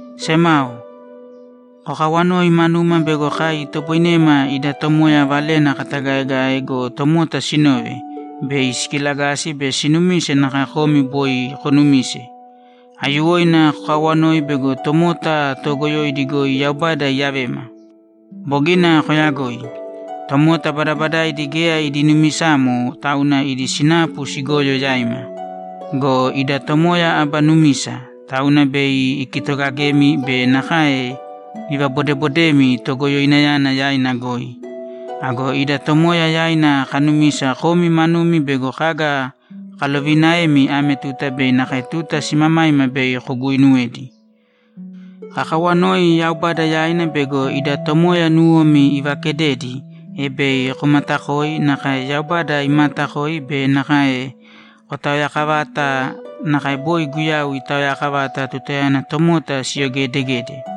Semao, kokaawanōi manuma bego kai itoboinema ida Tomoya Valena katagaegae go, tomota sinove, bei sikilagasi be sinumise nakae komi boi konumise. Aiyuwoina kokaawanōi bego tomota toogoyoidi goi Yaubada iiyavema. Bogina kooyagoi. Tomota badabadaidi geya idi numisamo, tauna idi sinapu sigoyo yaima. Go ida Tomoya aba numisa, tauna bei ikitoogagemi be nakae ivabodeebodemi Togoyoinayana yaina goi. Ago ida Tomoya yaina kanumisa komi manumi bego kaga kaloviinaemi ame tuta be nakae tuta simamaima bei koguuinuwedi. Kakawanoi Yaubada yaina bego ida Tomoya nuwomi ivaakededi, e bei komaatakoi nakae Yaubada imaatakoi be nakae kotaoyaakavata nakae boi Guyau itaoyakavata tutayana tomota siyogeedegede.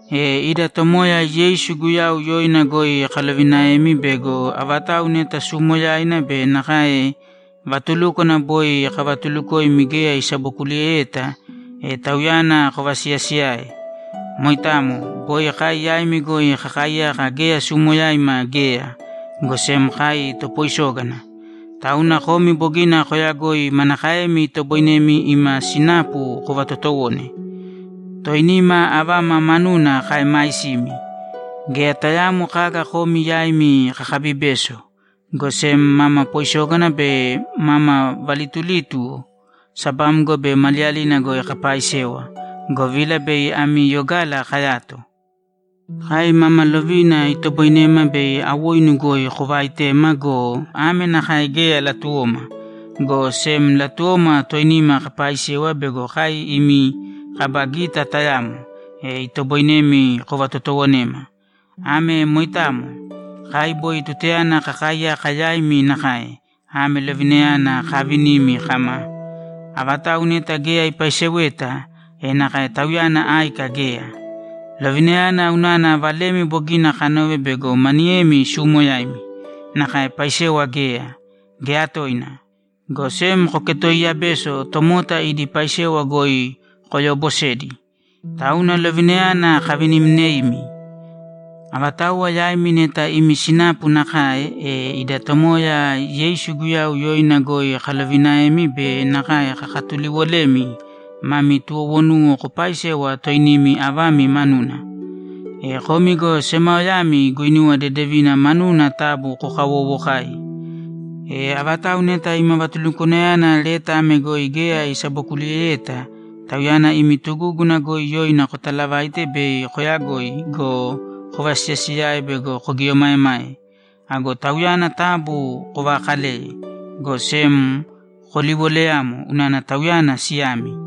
E ida Tomoya Yeisu Guyau yoina goi kalovinaemi bego avatau neta suumoyaina be nakae vatulúkwana boi kavatuulukoimi geya isabokuliyeyeta, e tauyana kovasiyaasiyāe. Moitamo. Boi kai yaimi goi kakaaiyaka geya suumoyaima geya, go sem kai topoisógana. Tauna komi bogina kooyagoi manakaemi itoboinemi ima sinapu kovatotowone. Toinima avama manuna kaeemaisimi. Geya tayaamo kaga komi yaimi kakaabibeso, go sem mama poisógana be mama valitulítuwo sabamgo be maliyalina goi kapaaisewa, govila bei ami yogala kayato. Kai mama lovina itoboinema bei awoinu goi kovaaitema go, ame nakae geya latuwoma, go sem latuwoma toinima kapaaisewa bego kai imi kaba gita tayamo, e itoboinemi kovatotoowonema. Ame moitamo. Kai boi tutayana kakaaiyaka yaimi nakae, ame lovinayana kavinimi kama, ‘Avatau neta geya ipaiseweta, e nakae tauyana áika geya.’ Lovinayana unana valemi bogina kanove bego maniyemi suumoyaimi, nakae paisewa geya, geya toina, go sem koketooiya beso tomota idi paisewa goi koyoobosedi. Tauna lovinayana kavinimneimi. Avatauwa yaimi neta imi sinapu nakae, e ida Tomoya Yeisu Guyau yoina goi kalovinaemi be nakae kakatuliwolemi mami tuwowonuwa kopaaisēwa toinimi avami manuna. E komi go semaoyami guinuwa dedevina manuna taabu kokawoowokāi. E avatau neta ima vatulukwanayana leta ame goi geya isabokuliyeyeta, tauyana imi tugúguna goi yoina kotalavāite bei koyagoi go, kovasiyaasiyāe bego kogieomaemae. Ago tauyana taabu kovaakalēye, go sem koliwoleyāmo unana tauyana siyami.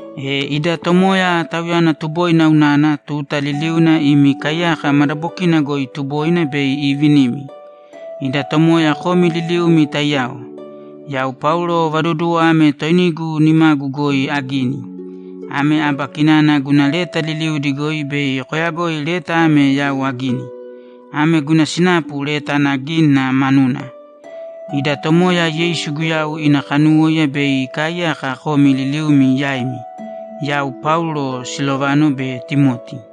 E ida Tomoya, Tauyana tuboina unana, tuta liliuna imi kaiyaka madabokina goi tuboina bei iivinimi. Ida Tomoya komi liliumi taiyao! Yau Paulo vaduduwo ame toinigu nimagu goi agini. Ame aba kinana guna leta liliudi goi bei koyagoi leta ame yau agini. Ame guna sinapu leta ana gínina manuna. Ida Tomoya Yeisu Guyau ina kanuwóiya bei ikaaiyaka komi liliumi yaimi. Yau Paulo, Silovano be Timoti